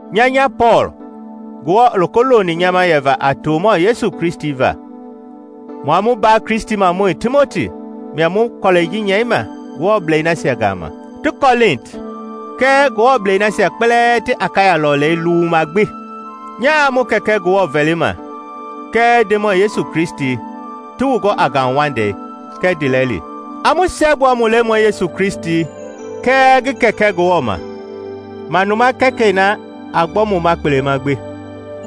Nya nya Pɔɔl, Ngewɔ i loko loni nyama yɛva a tomɔ Yesu Kristi va, mua mu mbaa Kristimɔi Timoti mia mu kɔlɛi ji nyɛima Ngewɔblei nasia gama ti Kɔlinti kɛɛ Ngewɔblei nasia kpɛlɛɛ ti Akaya lɔlei luwuma gbi. Nyaa mu Kɛkɛ Ngewɔ vɛlima kɛɛ Ndemɔi Yesu Kristi ti wu gɔ a ngauwaundei kɛɛ ndiilɛli. A mu siɛgbua mu Lemɔi Yesu Kristi ngi kɛɛ Kɛkɛ Ngewɔ ma, manuma Kɛkɛi na a gbɔ mu ma kpelema gbi.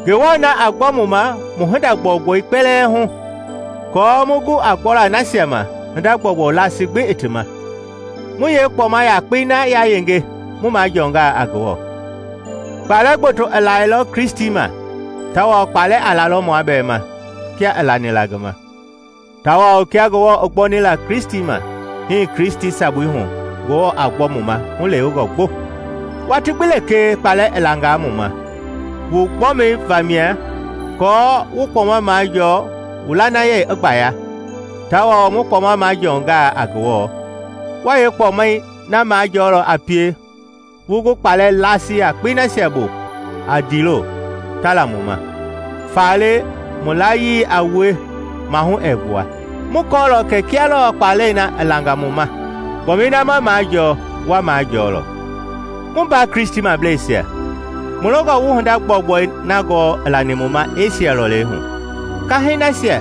Ngewɔ na a gbɔ mu ma mu hinda gbɔugbɔi kpɛlɛɛ hu aako mu gu a gbɔla nasia ma hinda gbɔugbɔu laasi gbi i ti ma; mu yeekpɔma yakpei na yayenge mu majɔɔnga a Ngewɔ. Kpalɛ gboto i lailɔ Kristi ma, tawao kpalɛ a lalɔ mua bɛɛ ma kia i lani la ngi ma; tawao kia Ngewɔ i gbɔni la Kristi ma, hii Kristi sabui hu Ngewɔ a gbɔ mu ma hulewengɔ gbo. Watii gbi lekee kpalɛ i langaa mu ma, wu gbɔmi vamia, aako wu kpɔma majɔɔ wu lanayei i gbaya; tawao mu kpɔma majɔɔnga a Ngewɔ, wa yeekpɔma yakpei na majɔɔlɔ a pie wu gu kpalɛ laasi yakpei nasia bu a ndiilo ta la mu ma. Faale mu layii a wue mahu ɛɛ gbua; mu kɔɔlɔ kɛ kia lɔɔ kpalɛi na i langa mu ma i langa wu ma, kpɔmɛi na ma majɔɔ wa majɔɔlɔ. Mu mbaa Kristimableisia, mu longɔ wu hinda gbɔugbɔi na gɔɔ i lani mu ma Esia lɔlei hu. Kahɛi nasia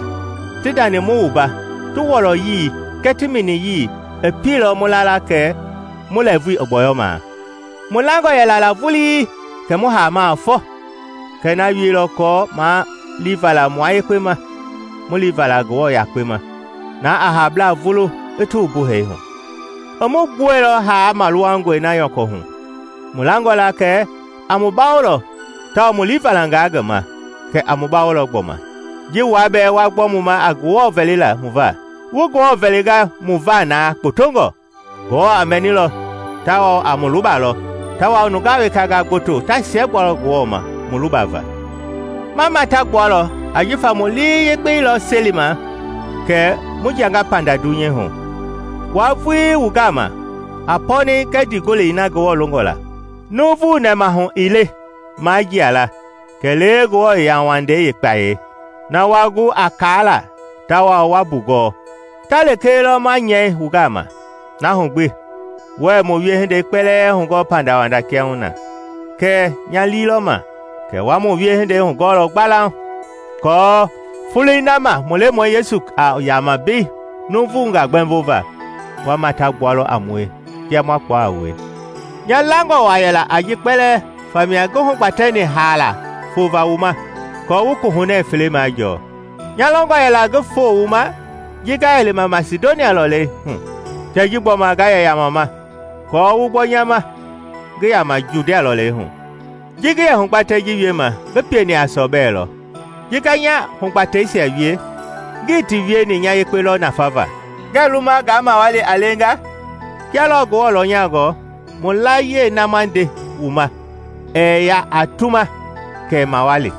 ti ndani mu wumba ti wɔlɔyii kɛɛ ti miniyii i pielɔ mu la la kɛ mu lɛɛvui i gbɔyɔmaa. Mu langɔ yɛla la vulii kɛ mu haamaa fɔ; kɛɛ na wieilɔ aako maa liivala mua yekpe ma, mu liivala Ngewɔ yakpe ma, na a haablaa vulu i ti wumbu hee hu. I mu gbuɛilɔ haa maluwangɔi na nyɔkɔ hu, mu langɔ la kɛ a mu bawolɔ tawao mu liivalanga ngi ma kɛ a mu bawolɔ gbɔma, ji wua bɛɛ wa gbɔ mu ma a Ngewɔ vɛlila mu va. Wu Ngewɔ vɛlingaa mu va na gbotongɔ, Ngewɔ a mɛnilɔ tawao a mu lubalɔ; tawao nungaa wekangaa gboto ta siɛgbualɔ Ngewɔ ma mu luba va. Ma mata gbualɔ ajifa mu lii yekpei lɔ selima kɛ mu jianga panda dunyei hu, wua vui wu gama, a pɔɔnɛi kɛɛ ndiigolei na Ngewɔ longɔ la. Nuuvu nɛmahulewe ii le maa jia la kɛlee Ngewɔ yauwandei yeekpayei. Na wa gu a kaala tawao wa mbugɔɔ, ta lekee lɔ ma nyɛi wu gama. Na hu gbi, wuɛɛ mu wiehindei kpɛlɛɛ hugɔɔ pandawanda kiahuna, kɛɛ nya lii lɔ ma kɛ wa mu wiehindei hugɔɔlɔ gbalauŋ, aako Foloi na ma mu Lemɔi Yesu a yama mbei nuuvunga gbɛmbova, wa mata gbualɔ a mue kia ma kpua a wue. Nya langɔ waa yɛla a ji kpɛlɛɛ famia ngi hugbatɛni haala fova wu ma aako wu kohunɛ fele majɔɔ. Nya longɔ yɛla ngi foo wu ma ji nga yɛ lima Masidonia lɔleihu kɛɛ ji gbɔma nga yɛ yamama aako wu gbɔ nya ma ngi yama Judia lɔleihu. Ji ngi yɛ hugbatɛi ji wiema ngi pieni a sɔbɛ lɔ. Ji nga nya hugbatɛisia wie, ngii ti wieni nya yekpe lɔ nafava, ngɛ luma nga mawali a leenga? Kia lɔɔ Ngewɔ lɔnyangɔ, mu layie na ma nde wu ma ɛɛ ya a tuma kɛɛ mawali.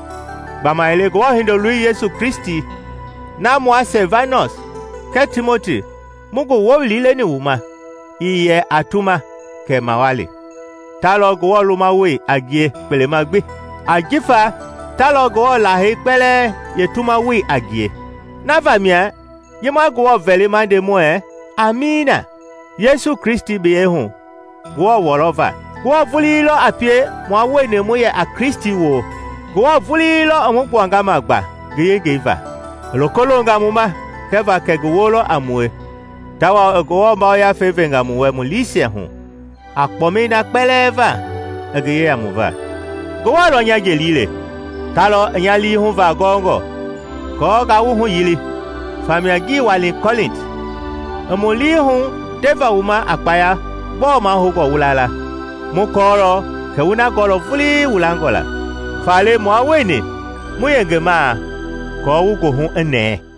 Gbamaile Ngewɔ Hindoloi Yesu Kristi na mua Silvanɔs kɛɛ Timoti mu ngi wowili leni wu ma, ii yɛ a tuma kɛɛ mawali, ta lɔ Ngewɔ lumawoi a ngie kpelema gbi; jifa ta lɔ Ngewɔ Lahei kpɛlɛɛ yeetumawoi a ngie. Na vamia ji ma Ngewɔ vɛli ma nde muɛɛ “Amiina” Yesu Kristi biyɛi hu Ngewɔ wɔlɔ va. Ngewɔ vulii lɔ a pie mua wueni mu yɛ a Kristi woo; Ngewɔ vulii lɔ i mu gbuanga ma gba ngi yengei va; i loko longa mu ma kɛva kɛ ngi woo lɔ a mue tawao i Ngewɔ Yafei venga mu wɛ mu liisia hu a kpɔmbɛi na kpɛlɛɛ va i ngi yeya mu va. Ngewɔ lɔ nya jeli le, ta lɔ i nya lii huvaa gɔngɔ! Aako ngaa wu huyili, famia ngii wani Kɔlinti. Ii mu lii hu ndeva wu ma a kpaya gbɔɔ mahoungɔ wu la la; mu kɔɔlɔ kɛ wu na gɔɔlɔ vulii wu langɔ la, faale mua wueni mu yengemaa aako wu goohu i nɛɛ.